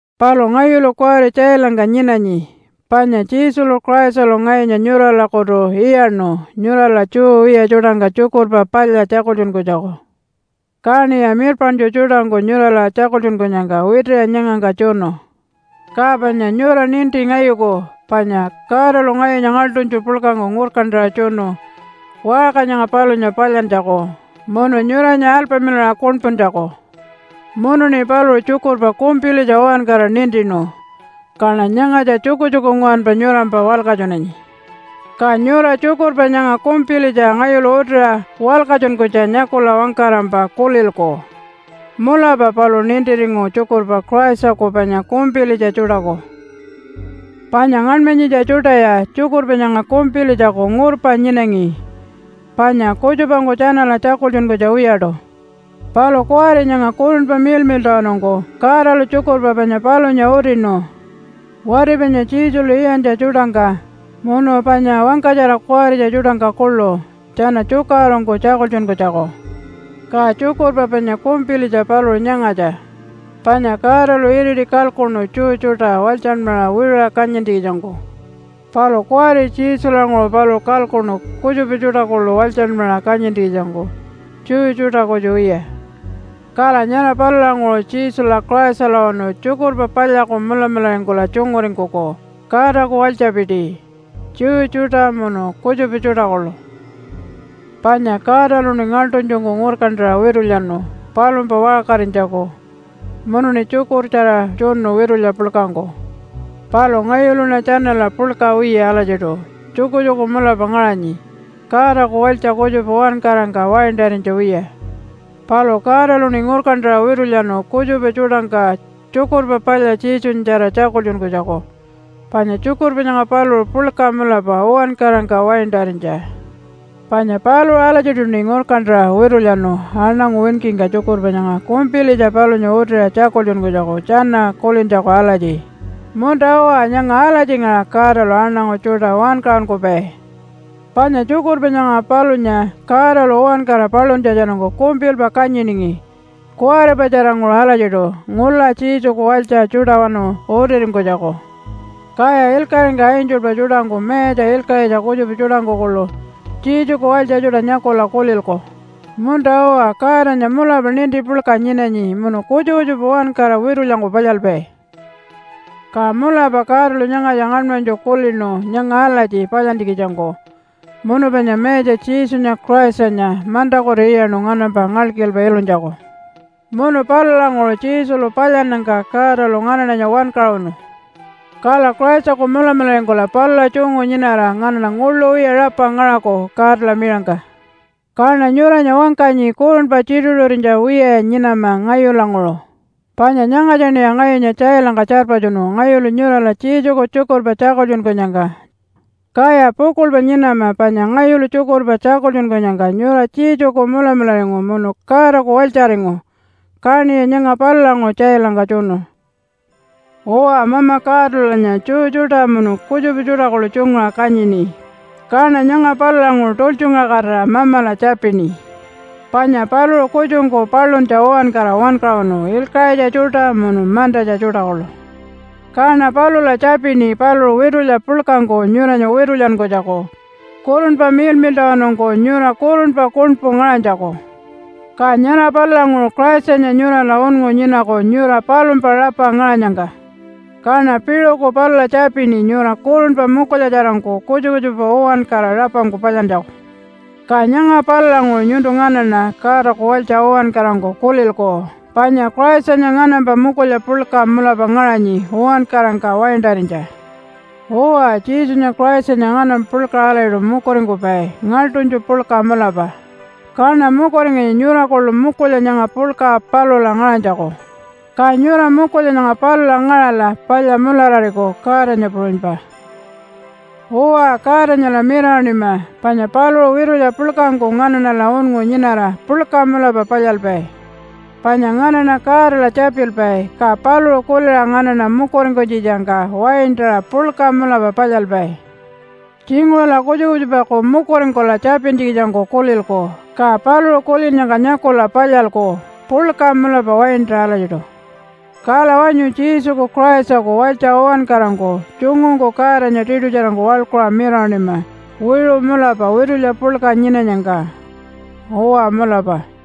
Palu ngayulu kuwari tjailangka nyinanyi, panya Jesulu Christalu ngayunya nyuralakutu iyaṉu nyurala Jew wiya tjuṯangka Tjukurpa Palya tjakultjunkunytjaku. Kaṉiya mirpaṉtju tjuṯangku nyurala tjakultjunkunyangka witiṟa nyangangka tjunu. Ka panya nyura ninti ngayuku, panya Godalu ngayunya ngaḻṯunytju puḻkangku ngurkantaṟa tjunu waṟka nyanga palunya palyantjaku munu nyuranya alpamilaṟa kuṉpuntjaku. Munuṉi paluṟu tjukurpa kumpilitja uwankara nintinu, kaṉa nyangatja tjukutjuku nguwanpa nyurampa walkatjunanyi. Ka nyura tjukurpa nyanga kumpilitja ngayulu utiṟa walkatjunkunytja nyakula wangkarampa kulilku, “Mulapa paluṟu nintiringu tjukurpa Christaku panya kumpilitja tjuṯaku.” Panya ngaṉmanyitja tjuṯaya tjukurpa nyanga kumpilitjaku ngurpa nyinangi, panya kutjupangku tjanala tjakultjunkunytja wiyaṯu. Palu kuwari nyanga Kurunpa Miḻmiḻṯawanungku Godalu tjukurpa panya palunya utinu, wati panya Jesulu iyantja tjuṯangka, munu panya wangkatjara kuwaritja tjuṯangka kuḻu tjana tjukaṟurungku tjakultjunkunytjaku. Ka tjukurpa panya kumpilitja paluṟu nyangatja panya Godalu iriti kalkuṉu Jew tjuṯa walytjanmaṟa wiṟuṟa kanyintjikitjangku. Palu kuwari Jesulanguṟu paluṟu kalkuṉu kutjupa tjuṯa kuḻu walytjanmaṟa kanyintjikitjangku Jew tjuṯa kutju wiya. Kala nyara palulanguṟu Jesula Christalawanu tjukurpa palyaku mulamularingkula tjunguringkuku Godaku walytjapiti, Jew tjuṯa munu kutjupa tjuṯa kuḻu. Panya Godaluṉi ngaḻṯunytjungku ngurkantaṟa witulyanu palumpa waṟkarinytjaku munuṉi tjukurtjara tjunu witulya puḻkangku. Palu ngayuluṉa tjanala puḻka wiya alatjiṯu tjukutjuku mulapa ngaṟanyi, Godaku walytja kutjupa uwankarangka waintarinytja wiya. Palu Godaluṉi ngurkantaṟa witulyanu kutjupa tjuṯangka Tjukurpa Palya Jesunyatjara tjakultjunkunytjaku, panya tjukurpa nyanga paluṟu puḻka mulapa uwankarangka waintarinytja. Panya paluṟu alatjiṯuṉi ngurkantaṟa witulyanu aṉangu winkingka tjukurpa nyanga kumpilitja palunya utiṟa tjakultjunkunytjaku tjana kulintjaku alatji, “Munta-uwa, nyanga alatjingaṟa Godalu aṉangu tjuṯa wankaṟunkupai.” Panya tjukurpa nyara palunya Godalu uwankara paluntjatjanungku kumpilpa kanyiningi kuwaripatjaranguṟu alatjiṯu ngula Jesuku walytja tjuṯawanu utiringkunytjaku. Kaya ilkaṟingka angelpa tjuṯangku mayatja ilkaṟitja kutjupa tjuṯangku kuḻu Jesuku walytja tjuṯa nyakula kulilku, “Munta-uwa, Godanya mulapa ninti puḻka nyinanyi munu kutjupa kutjupa uwankara witulyangku palyalpai.” Ka mulapa Godalu nyangatja ngaṉmanytju kulinu nyanga alatji palyantjikitjangku munu panya Mayatja Jesunya Christanya mantakutu iyaṉu nganampa ngalkilpa ilunytjaku. Munu palulanguṟu Jesulu palyannyangka Godalu nganaṉanya wankaṟunu. Kala Christaku mulamularingkula palula tjungu nyinara nganaṉa nguḻu wiya rapa ngaṟaku Godala miṟangka. Kaṉa nyuranya wangkanyi kurunpa tjituṟu-tjituṟurinytja wiyaya nyinama ngayulanguṟu, panya nyangatjaṉiya ngayunya tjailangka tjarpatjunu, ngayulu nyurala Jesuku tjukurpa tjakultjunkunyangka. Kaya pukuḻpa nyinama panya ngayulu tjukurpa tjakultjunkunyangka nyura Jesuku mulamularingu munu Godaku walytjaringu, kaṉiya nyanga palulanguṟu tjailangka tjunu. Uwa, Mama Godalulanya Jew tjuṯa munu kutjupa tjuṯa kuḻu tjunguṟa kanyini. Kaṉa nyanga palulanguṟu tultjungaṟakatira Mamala tjapini. Panya paluṟu kutjungku paluntja uwankara wankaṟunu ilkaṟitja tjuṯa munu mantatja tjuṯa kuḻu. Kaṉa palula tjapini paluṟu witulya puḻkangku nyuranya witulyankunytjaku, Kurunpa Miḻmiḻṯawanungku, nyura kurunpa kuṉpu ngaṟanytjaku. Ka nyara palulanguṟu Christanya nyurala unngu nyinaku nyura palumpa rapa ngaṟanyangka. Kaṉa piṟuku palula tjapini nyura kurunpa mukulyatjarangku kutjupa kutjupa uwankara rapangku palyantjaku. Ka nyanga palulanguṟu nyuntu nganaṉa Godaku walytja uwankarangku kulilku panya Christanya nganampa mukulya puḻka mulapa ngaṟanyi uwankarangka waintarinytja. Uwa, Jesunya Christanya nganampa puḻkaṟa alatjiṯu mukuringkupai ngaḻṯunytju puḻka mulapa, kaṉa mukuringanyi nyura kuḻu mukulya nyanga puḻka palula ngaṟanytjaku, ka nyura mukulya nyanga palula ngaṟala palya mularariku Godanya puṟunypa. Uwa, Godanyala mirawaṉima. Panya paluṟu witulya puḻkangku nganaṉala unngu nyinara puḻka mulapa palyalpai. Panya nganaṉa Godala tjapilpai ka paluṟu kuliṟa nganaṉa mukuringkunytjitjangka waintaṟa puḻka mulapa palyalpai. Tjinguṟula kutjupa kutjupaku mukuringkula tjapintjikitjangku kulilku, ka paluṟu kulinnyangka nyakula palyalku puḻka mulapa waintaṟa alatjiṯu. Kala wanyu Jesuku Christaku walytja uwankarangku tjungungku Godanya tiṯutjarangku waḻkuṟa mirawaṉima wiṟu mulapa witulya puḻka nyinanyangka. Uwa, mulapa.